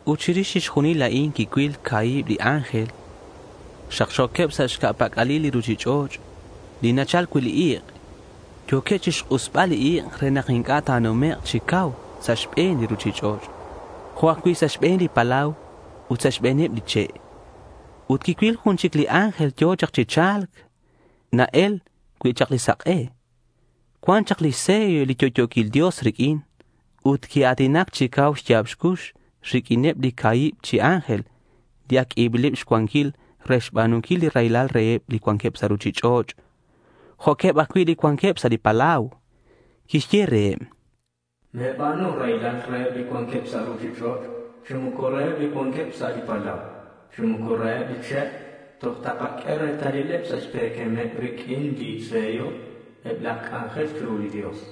Ut chirix chixjunil a'in quicuil ca̱hib li ángel xakxo̱queb sa' xca̱ pac'alil li ruchich'och' li nachal cui' li ik'. Yo̱queb chixk'usbal li ik' re nak inc'a' ta̱numek' chi cau sa' xbe̱n li ruchich'och' jo' ajcui' sa' xbe̱n li palau ut sa' xbe̱neb li che'. Ut quicuil jun chic li ángel yo̱ chak chi cha̱lc na-el cui' chak li sak'e. Cuan chak lix sello li yo'yo̱quil Dios riq'uin. Ut quia̱tinac chi cau xya̱b xcux riq'uineb li ca̱hib chi ángel li ac q'uebileb xcuanquil re xba̱nunquil raylal reheb li cuanqueb sa' ruchich'och', jo'queb ajcui' li cuanqueb sa' li palau. Quixye reheb: —Me̱ba̱nu raylal reheb li cuanqueb sa' ruchich'och' chi moco reheb li cuanqueb sa' li palau chi moco reheb li che'. Toj takaq'ue retalileb sa' xpe̱quemeb riq'uin li sello eb laj c'anjel chiru li Dios.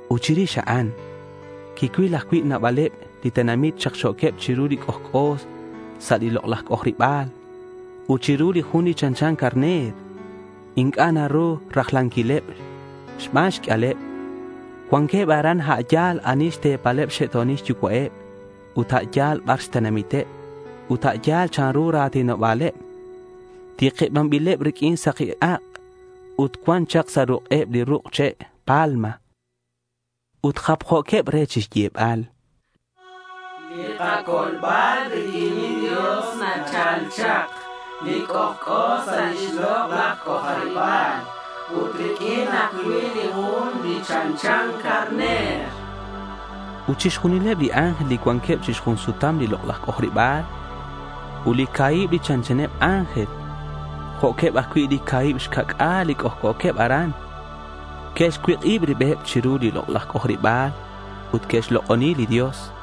Ut chirix a'an, quicuil ajcui' nabaleb chi tenamit xakxo̱queb chiru li c'ojc'o sa' lix lok'laj c'ojariba̱l ut chiru li Jun li chanchan carner. Inc'a' naru rajlanquileb xban xq'uialeb. Cuanqueb aran a' yal ani xte̱paleb xxe'to̱nil xyucua'eb ut a' yal bar xtenamiteb ut a' yal chanru li ra̱tinoba̱leb. Tikibanbileb riq'uin saki ak' ut cuan chak sa' ruk'eb li ruk' che' palma. Ut japjo̱queb re chixyebal: —Li kacolbal riq'uin li Dios nachal chak, li c'ojc'o sa' lix lok'laj c'ojariba̱l, ut riq'uin ajcui' li Jun li chanchan carner.— Ut chixjunileb li ángel li cuanqueb chi xjun sutam li lok'laj c'ojariba̱l ut li ca̱hib li chanchaneb ángel, jo'queb ajcui' li ca̱hib xca'c'a̱l li c'ojc'o̱queb aran, que'xcuik'ib ribeb chiru li lok'laj c'ojariba̱l ut que'xlok'oni li Dios.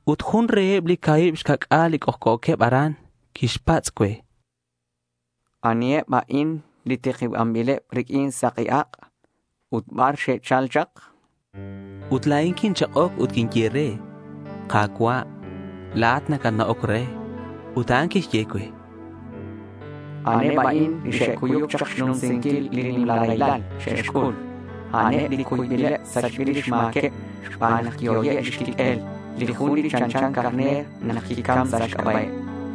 Ut jun reheb li ca̱hib xca'c'a̱l li c'ojc'o̱queb aran quixpatz' cue: —¿Aniheb a'in li tikibanbileb riq'uin saki ak'? ut ¿Bar xe'chal chak? Ut la̱in quinchak'oc ut quinye re: —Ka̱cua', la̱at nacatna'oc re. Ut a'an quixye cue: —A'aneb a'in li xe'cuyuc chak xnumsinquil li nimla raylal xe'xc'ul. A'aneb li cuybil sachbil lix ma̱queb xban nak quihoye' xquiq'uel li Jun li chanchan carner nak quicam sa' xc'aba'eb.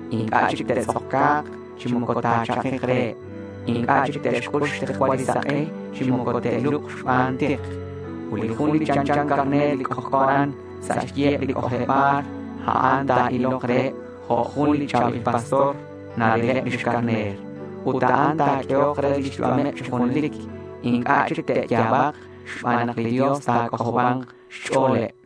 Inc'a' chic te'tz'oca̱k chi moco ta̱chakik reheb. Inc'a' chic te'xc'ul xtikcual li sak'e chi moco te'lubk xban tik. Ut li Jun li chanchan carner li c'ojc'o aran sa' xyiheb li c'ojariba̱l, a'an ta̱ilok reheb jo' jun li cha̱bil pastor narileb lix carner. Ut a'an ta̱q'uehok re lix yu'ameb chi junelic. Inc'a' chic te'ya̱bak xban nak li Dios ta̱c'ojoba̱nk xch'o̱leb.—